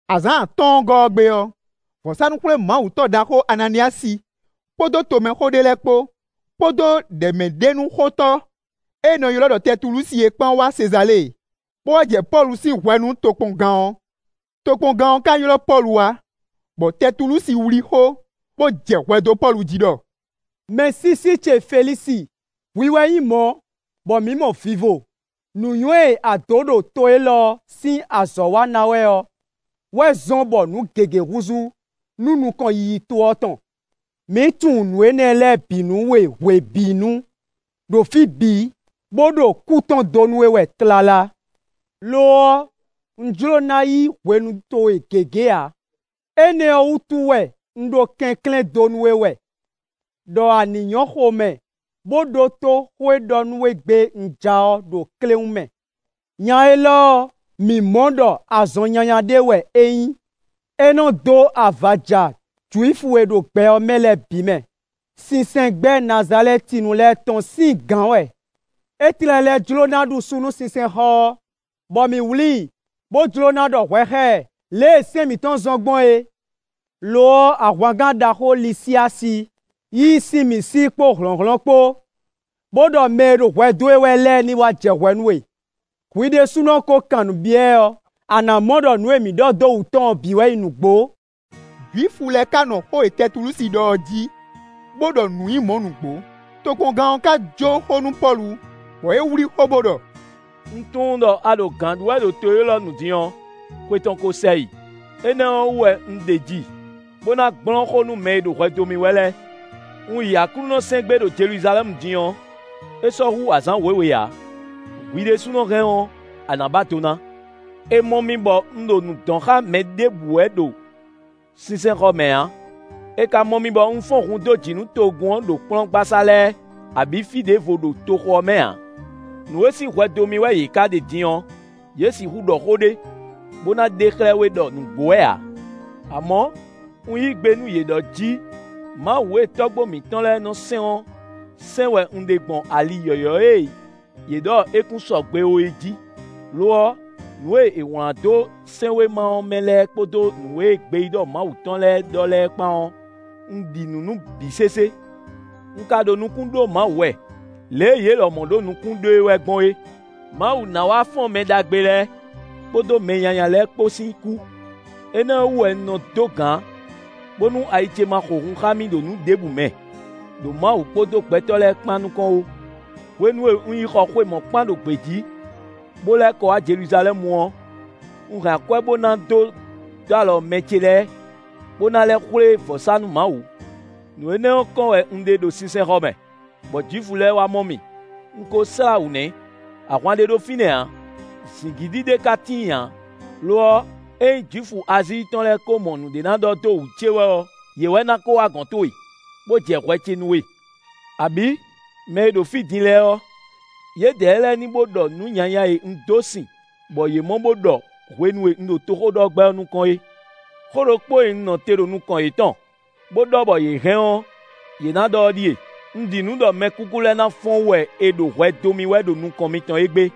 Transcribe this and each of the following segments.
Azǎn atɔ́ɔ́ngɔ́ ɔ́ gbe ɔ́, vɔ̌sánú-xwlémawutɔ́ ɖaxó Ananíyasi kpódó tomɛxó ɖé lɛ́ɛ kpó, kpódó ɖɛ̌mɛɖenúxótɔ́ e è nɔ ylɔ́ ɖɔ Tɛtulúsi é kpán wá Sezalée, bó wá jɛ Pɔ́lu sín hwɛ nú tokpɔngán ɔ́. Tokpɔngán ɔ́ ka ylɔ́ Pɔ́lu wá, bɔ Tɛtulúsi wlí xó, bó jɛ hwɛ dó Pɔ́lu jí ɖɔ: “Mɛsísí ce Felísi, hwi wɛ nyí mɔ̌, bɔ mǐ mɔ vivo; nǔnywɛ́ e a dǒ ɖo to élɔ́ sín azɔ̌ wa ná wɛ ɔ́ wɛ zɔ́n bɔ nǔ gěgé húzú nú nukɔn yiyi to ɔ́ tɔn. Mǐ tunwun nǔ énɛ́ lɛ́ɛ bǐ nú we hwebǐnu, ɖo fí bǐ, bó ɖo kú tɔn dó nú we wɛ tlala. Lo ɔ́, un jló ná yí hwenu towe gěgé ǎ, énɛ́ ɔ́ wútu wɛ un ɖo kɛnklɛ́n dó nú we wɛ, ɖɔ a ní nyɔ̌ xomɛ, bó ɖótó xó e ɖɔ nú we gbé un ja ɔ́ ɖo kléwún mɛ. Nya élɔ́ ɔ́, mǐ mɔ ɖɔ azɔn nyanya ɖé wɛ é nyí; é nɔ́ dó avaja Jwifu e ɖo gbɛ ɔ́ mɛ lɛ́ɛ bǐ mɛ; sinsɛngbɛ́ Nazalɛ́tinu lɛ́ɛ tɔn sín gǎn wɛ. É tlɛ lɛ́ jló ná ɖu su nú sinsɛnxɔ ɔ́, bɔ mǐ wlí i, [bó jló ná ɖɔ hwɛ xá ɛ lě e sɛ́n mǐtɔn zɔ́n gbɔn é. Lo ɔ́, ahwangán ɖaxó Lizyási yí i sín mǐ sí kpó hlɔ̌nhlɔ́n kpó, bó ɖɔ mɛ e ɖo hwɛ dó e wɛ lɛ́ɛ ní wá jɛ hwɛ nú we.] Hwi ɖésúnɔ kó kan nǔ byɔ́ ɛ ɔ́, a nǎ mɔ ɖɔ nǔ e mǐ ɖɔ dó wǔ tɔn ɔ́ bǐ wɛ nyí nǔgbó.” Jwifu lɛ́ɛ ka nɔ xó e Tɛtulúsi ɖɔ ɔ́ jí, bó ɖɔ nǔ nyí mɔ̌ nǔgbó. Tokpɔngán ɔ́ ka jó xó nú Pɔ́lu, bɔ é wlí xó bo ɖɔ: “Un tunwun ɖɔ a ɖo gǎn ɖu wɛ ɖo to élɔ́ nu din ɔ́, xwe tɔn ko sɛ yi; énɛ́ ɔ́ wú wɛ un ɖeji, bó ná gblɔ́n xó nú mɛ e ɖo hwɛ dó mì wɛ lɛ́ɛ. Un yi Aklúnɔ sɛn gbé ɖo Jeluzalɛ́mu din ɔ́, é sɔ́ hú azǎn wěwe ǎ; hwi ɖésúnɔ hɛn ɔ́, a nǎ ba do ná. È mɔ mì bɔ un ɖo nǔ dɔn xá mɛ ɖěbǔ wɛ ɖo sinsɛnxɔ mɛ ǎ, è ka mɔ mì bɔ un fɔ́n hun dó jǐ nú togun ɔ́ ɖo kplɔ́ngbasá lɛ́ɛ, abǐ fí ɖěvo ɖo toxo ɔ́ mɛ ǎ. Nǔ e sín hwɛ dó mì wɛ yě ka ɖe din ɔ́, yě sixú ɖɔ xó ɖé, bó ná ɖe xlɛ́ we ɖɔ nǔgbó wɛ ǎ. Amɔ̌, un yí gbe nú yě ɖɔ jí Mawu e tɔ́gbó mǐtɔn lɛ́ɛ nɔ sɛn ɔ́ sɛn wɛ un ɖe gbɔn ali yɔ̌yɔ́ e yě ɖɔ é kún sɔgbe ó é jí; lo ɔ́, nǔ e è wlán dó sɛ́nwéma ɔ́ mɛ lɛ́ɛ kpódó nǔ e gbeyíɖɔ Mawu tɔn lɛ́ɛ ɖɔ lɛ́ɛ kpán ɔ́, un ɖi nǔ nú bǐ sésé. Un ka ɖo nukún ɖó Mawu wɛ, lě e yě lɔmɔ̌ ɖo nukún ɖó e wɛ gbɔn é. Mawu ná wá fɔ́n mɛ ɖagbe lɛ́ɛ, kpódó mɛ nyanya lɛ́ɛ kpó sín kú. Énɛ́ ɔ́ wú wɛ un nɔ dó gǎn, bónú ayi ce ma xo hun xá mì ɖo nǔ ɖěbǔ mɛ, ɖo Mawu kpódó gbɛtɔ́ lɛ́ɛ kpán nukɔn ó. “Hwenu e un yi xɔ xwe mɔ̌kpán ɖo gbějí, bó lɛ́ kɔ wá Jeluzalɛ́mu ɔ́, un hɛn akwɛ́ bó ná dó dó alɔ mɛ ce lɛ́ɛ, bó ná lɛ́ xwlé vɔ̌sánú Mawu. Nǔ énɛ́ ɔ́ kɔn wɛ un ɖe ɖo sinsɛnxɔ mɛ, bɔ Jwifu lɛ́ɛ wá mɔ mì; un ko slá wǔ nɛ́; ahwan ɖé ɖo fínɛ́ ǎ; zǐngídi ɖé ka tíin ǎ, lo ɔ́, ényí Jwifu Azíi tɔn lɛ́ɛ ko mɔ nǔɖé ná ɖɔ dó wú ce wɛ ɔ́, yě wɛ ná kó wá gɔ̌n towe, bó jɛ hwɛ ce nú we. Abǐ, mɛ e ɖo fí din lɛ́ɛ ɔ́, yědɛɛ lɛ́ɛ ní bo ɖɔ nǔ nyanya e un dó sin bɔ yě mɔ bo ɖɔ hwenu e un ɖo toxóɖɔgbɛ́ ɔ́ nukɔn é. Xó ɖokpó e un nɔ te ɖo nukɔn yětɔn, bó ɖɔ bɔ yě hɛn ɔ́, yě ná ɖɔ ɔ́ ɖíe: ‘Un ɖi nǔ ɖɔ mɛkúkú lɛ́ɛ ná fɔ́n wú wɛ è ɖo hwɛ dó mì wɛ ɖo nukɔn mitɔn égbé.’”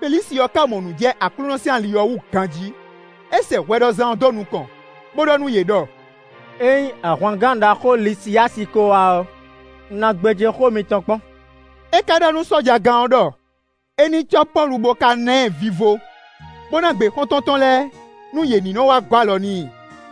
Felísi ɔ́ ka mɔ nǔ jɛ Aklúnɔ sín ali ɔ́ wú ganjí. É sɛ hwɛɖɔzán ɔ́ dó nukɔn, bó ɖɔ nú yě ɖɔ: “Ényí ahwangán ɖaxó Lisiyási ko wá ɔ́, un ná gbéjé xó mitɔn kpɔ́n.” É ka ɖɔ nú sɔ́jagán ɔ́ ɖɔ é ní cɔ́ Pɔ́lu bó ka ná ɛ vivo, bó ná gbe xɔ́ntɔn tɔn lɛ́ɛ, nú yě ní nɔ wá gɔ́ alɔ n'i.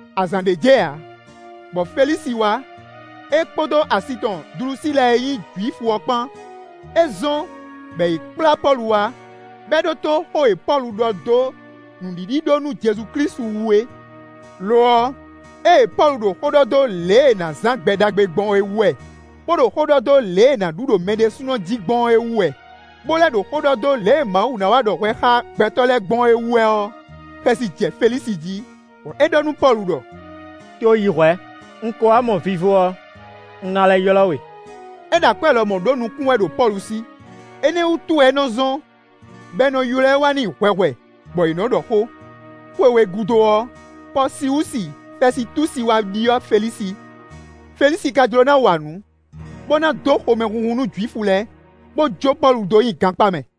Azǎn ɖé jɛ ǎ, bɔ Felísi wá, é kpódó asi tɔn Dlusíla e nyí Jwifu ɔ́ kpán. É zɔ́n, bɔ è ylɔ́ Pɔ́lu wá, bɔ é ɖótó xó e Pɔ́lu ɖɔ dó nǔɖiɖi ɖó nú Jezu Klísu wú é. Lo ɔ́, ée Pɔ́lu ɖo xó ɖɔ dó lě e è nǎ zán gbɛ ɖagbe gbɔn é wú wɛ, bó ɖo xó ɖɔ dó lě e è nǎ ɖu ɖo mɛ ɖésúnɔ jí gbɔn é wú wɛ, bó lɛ́ ɖo xó ɖɔ dó lě e Mawu na wá ɖɔ hwɛ xá gbɛtɔ́ lɛ́ɛ gbɔn ɔ́ wú wɛ ɔ́, xɛsi jɛ Felísi jí, bɔ é ɖɔ nú Pɔ́lu ɖɔ: “To yi hwɛ̌; un ko wá mɔ vivo ɔ́, un ná lɛ́ ylɔ́ we.” É ɖo akwɛ́ lɔmɔ̌ ɖó nukún wɛ ɖo Pɔ́lu sí; énɛ́ wútu wɛ é nɔ zɔ́n, bɔ è nɔ ylɔ́ ɛ wá n'i hwɛhwɛ, bɔ yě nɔ ɖɔ xó. Xwe we gúdo ɔ́, Pɔsiwusi Fɛsitúsi wá ɖyɔ́ Felísi. Felísi ka jló ná wa nǔ, bó ná dó xomɛhunhun nú Jwifu lɛ́ɛ, bó jó Pɔ́lu dó nyi gankpá mɛ.